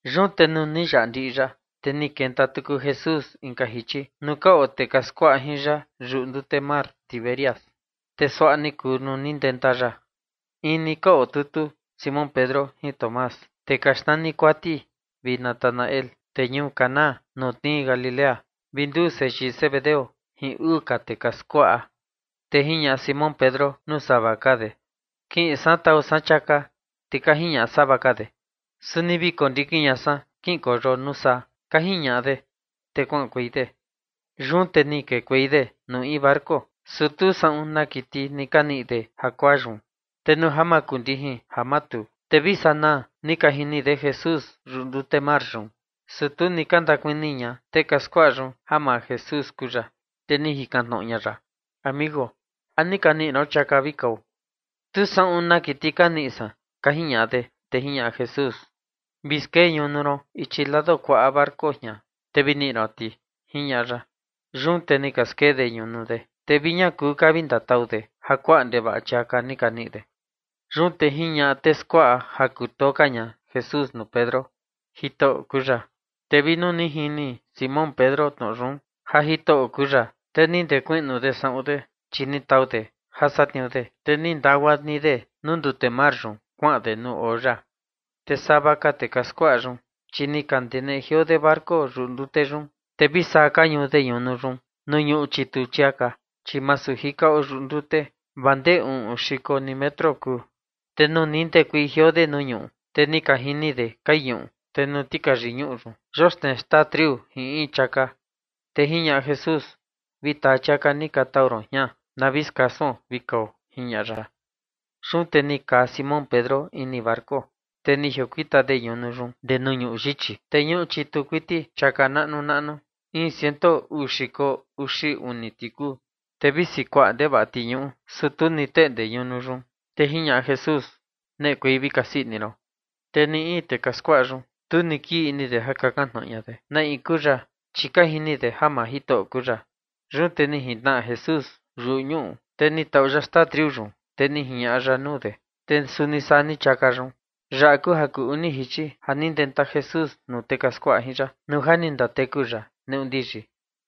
Yun te nuu ni yaꞌa ndiꞌi yaꞌa, te ni ndenta tuku Jesús inka jichi nuu ka oo tee ka skuaꞌa jin ya yuꞌu ndute mar Tiberias, te suaꞌa ni kuu nuu ni ndenta ya. In ni ka otutu Simón Pedro jin Tomás, tee ka xnani Kuati, vi Natanael, tee ñuu Caná ja tnii Galilea, vi nduu seyii Zebedeo jin uu ka tee ka skuaꞌa. Te jiñaꞌa Simón Pedro nuu sava ka de: ―Kiꞌin san tau san chiaka. Te ka jiñaꞌa sava ka de: ―Suni vi kondikin ña san, kiꞌinkueio nuu saa ―ka jiñaꞌa de. Te kuaꞌankuei de, yun te ni kekuei de nuu in barco, su tu saꞌun na kiti ni ka niꞌi de jakuaa yun. Te nuu ja makundijin ja matuu, te vi sanaa ni ka jini de Jesús yuꞌu ndute mar yun, su tu ni ka ndakuni ña tee ka skuaꞌa yun ja maa Jesús kuu ya. Te ni jikan tnoꞌo ña ya: ―Amigo, ¿a ni ka niꞌi ron chiaka vi kao? ―Tu saꞌun na kiti ka niꞌi san ―ka jiñaꞌa de. Te jiñaꞌa Jesús: ―Vi skee ñunu ron ichi lado kuaꞌa barco jian, te vi niꞌi ron ti ―jiñaꞌa ya. Yun te ni ka skee de ñunu de, te vi ña kuu ka vi ndatau de ja kuaꞌa ndevaꞌa chiaka ni ka niꞌi de. Yun te jiñaꞌa tee skuaꞌa ja kutoo ka ña Jesús nuu Pedro: ―Jitoꞌo kuu ya. Te vi nuu ni jini Simón Pedro tnoꞌo yun, ja Jitoꞌo kuu ya, te ni ndakiꞌin de saꞌun de, chi ni tau de ja satniuu de, te ni ndagua ni de nuu ndute mar yun, kuaꞌan de nuu oo ya. Te sava ka tee ka skuaꞌa yun, chi ni ka ndeneꞌe jioo de barco yuꞌu ndute yun, te vi saa ka ñuu de ñunu yun ñuꞌu chitu chiaka, chi masu jika oo yuꞌu ndute vaa ndee uꞌun xiko ni metro kuu. Te nuu ndekuei jioo de nuu ñuꞌu, te ni ka jini de kai ñuꞌu, te nuu tikayi ñuꞌu yun yoxnee xtaa triu jin in chiaka. Te jiñaꞌa Jesús: ―Vi taa chiaka ni ka tau ron jian na vi skasuon vi kao ―jiñaꞌa ya. Yun te ni kaa Simón Pedro ini barco, te ni jiokuita de ñunu yun guaa ndee nuu ñuꞌu yichi, te ñuꞌu chitu kuiti chiaka naꞌnu naꞌnu, in ciento uu xiko uxi uni ti kuu. Te visi kuaꞌa ndevaꞌa ti ñuꞌu, su tu ni teꞌnde ñunu yun. Te jiñaꞌa Jesús: ―Neꞌekuei vi kasii ini ron. Te ni in tee ka skuaꞌa yun, tu ni kii ini de ja kakan tnoꞌo ña de na in kuu ya, chi ka jini de ja maa Jitoꞌo kuu ya. Yun te ni jintnaꞌa Jesús yuꞌu ñuꞌu, te ni tau ya xtaa triu yun, te ni jiñaꞌa ya nuu de, te suni saa ni chiaka yun. Yaꞌa kuu jichi kuu uni ja ni ndenta Jesús nuu tee ka skuaꞌa jin ya, nuu ja ni ndateku ya neꞌu ndiyi.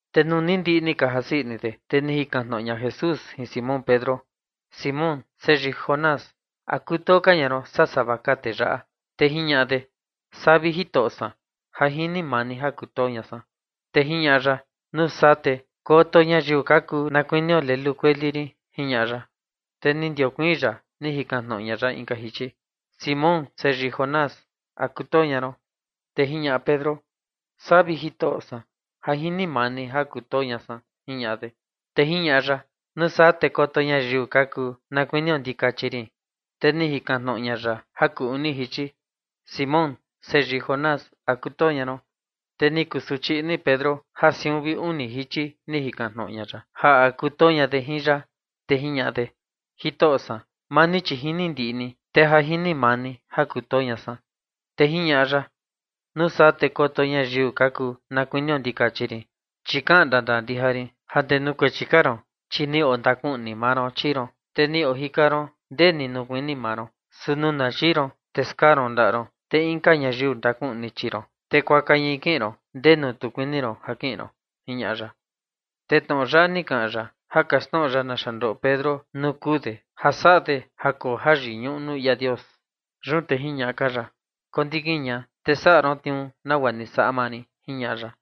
Te nuu ni ndiꞌi ni ka jasii ini de, te ni jikan tnoꞌo ña Jesús jin Simón Pedro: ―Simón, seyii Jonás, ¿a kutoo ka ña ron, saa sava ka tee yaꞌa? Te jiñaꞌa de: ―Saa, vi Jitoꞌo san, ja jini maa ni ja kutoo ña san. Te jiñaꞌa ya: ―Nuu saa te koto ñayiu ka kuu na kuinio lelu kueli rin ―jiñaꞌa ya. Te ni ndiokuiin ya ni jikan tnoꞌo ña ya inka jichi: ―Simón seyii Jonás, ¿a kutoo ña ron? Te jiñaꞌa Pedro: ―Saa, vi Jitoꞌo san, ja jini maa ni ja kutoo ña san. Te jiñaꞌa ya: ―Nuu saa te koto ñayiu ka kuu na kuinio ndikachi rin. Te ni jikan tnoꞌo ña ya jichi kuu uni: ―Simón seyii Jonás, ¿a kutoo ña ron? Te ni kusuchi ini Pedro ja siun vi uni jichi jikan tnoꞌo ña ya ja a kutoo de jin ya, te jiñaꞌa de: ―Jitoꞌo san, maa ni chi jini ndiꞌi ni, te ja jini maa ni ja kutoo ña san. Te jiñaꞌa ya: ―Nuu saa te koto ñayiu ka kuu na kuinio ndikachi rin. Chi kaꞌan ndandaa ndija rin, ja ndee nuu kuechi ka ron, chi ni ondakuꞌni maa ron chii ron, te ni ojika ron ndee ni nuu kuini maa ron. Su nuu na yii ron, te skaa ron ndaꞌa ron, te inka ñayiu ndakuꞌni chii ron, te kuaka ñai kiꞌin ron ndenu tu kuini ron ja kiꞌin ron ―jiñaꞌa ya. Te tnoꞌo yaꞌa ni kaꞌan ya ja kaxtnoꞌo ya naxa ndoꞌo Pedro nuu kuu de ja saꞌa de ja koo jayiñuꞌu nuu ia Dios. Yun te jiñaꞌa ka ya: ―Kondikin ña, te saꞌa ron tniuu nagua ni saꞌa maa rin ―jiñaꞌa ya.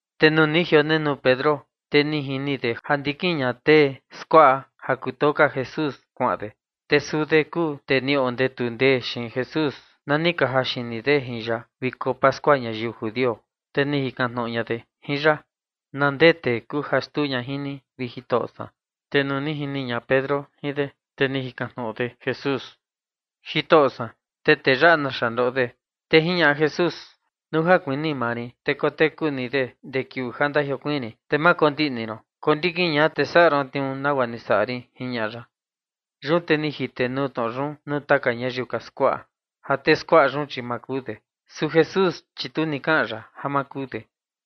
Te nuu ni jionenuu Pedro, te ni jini de ja ndikin ña tee skuaꞌa ja kutoo ka Jesús, kuaꞌan de. Te suu de kuu tee ni ondetu ndee xiin Jesús na ni ka jaxini de jin ya viko pascua ñayiu judio, te ni jikan tnoꞌo ña de jin ya: “¿Na ndee tee kuu ja xtuu ña jin ni, vi Jitoꞌo san?” Te nuu ni jini ña Pedro jin de, te ni jikan tnoꞌo de Jesús: ―Jitoꞌo san, ¿te tee yaꞌa, naxa ndoꞌo de? Te jiñaꞌa Jesús: ―Nuu ja kuini maa rin te koteku ni de guaa ndee kiuu ja ndajiokuiin rin, te ma kondiꞌni ron. Kondikin ña, te saꞌa ron tniuu nagua ni saꞌa rin ―jiñaꞌa ya. Yun te ni jitenuu tnoꞌo yun nuu taka ñayiu ka skuaꞌa, ja tee skuaꞌa yun, chi ma kuu de. Su Jesús, chi tu ni kaꞌan ya ja ma kuu de.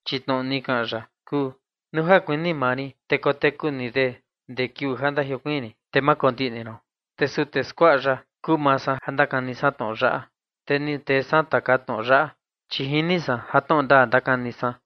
Chi tnoꞌo ni kaꞌan ya kuu: “Nuu ja kuini maa rin, te koteku ni de guaa ndee kiuu ja ndajiokuiin rin, te ma kondiꞌni ron”. Te suu tee skuaꞌa yaꞌa kuu maa san ja ndakani san tnoꞌo yaꞌa, te ni tee san taka tnoꞌo yaꞌa, chi jini san ja tnoꞌo ndaa ndakani san.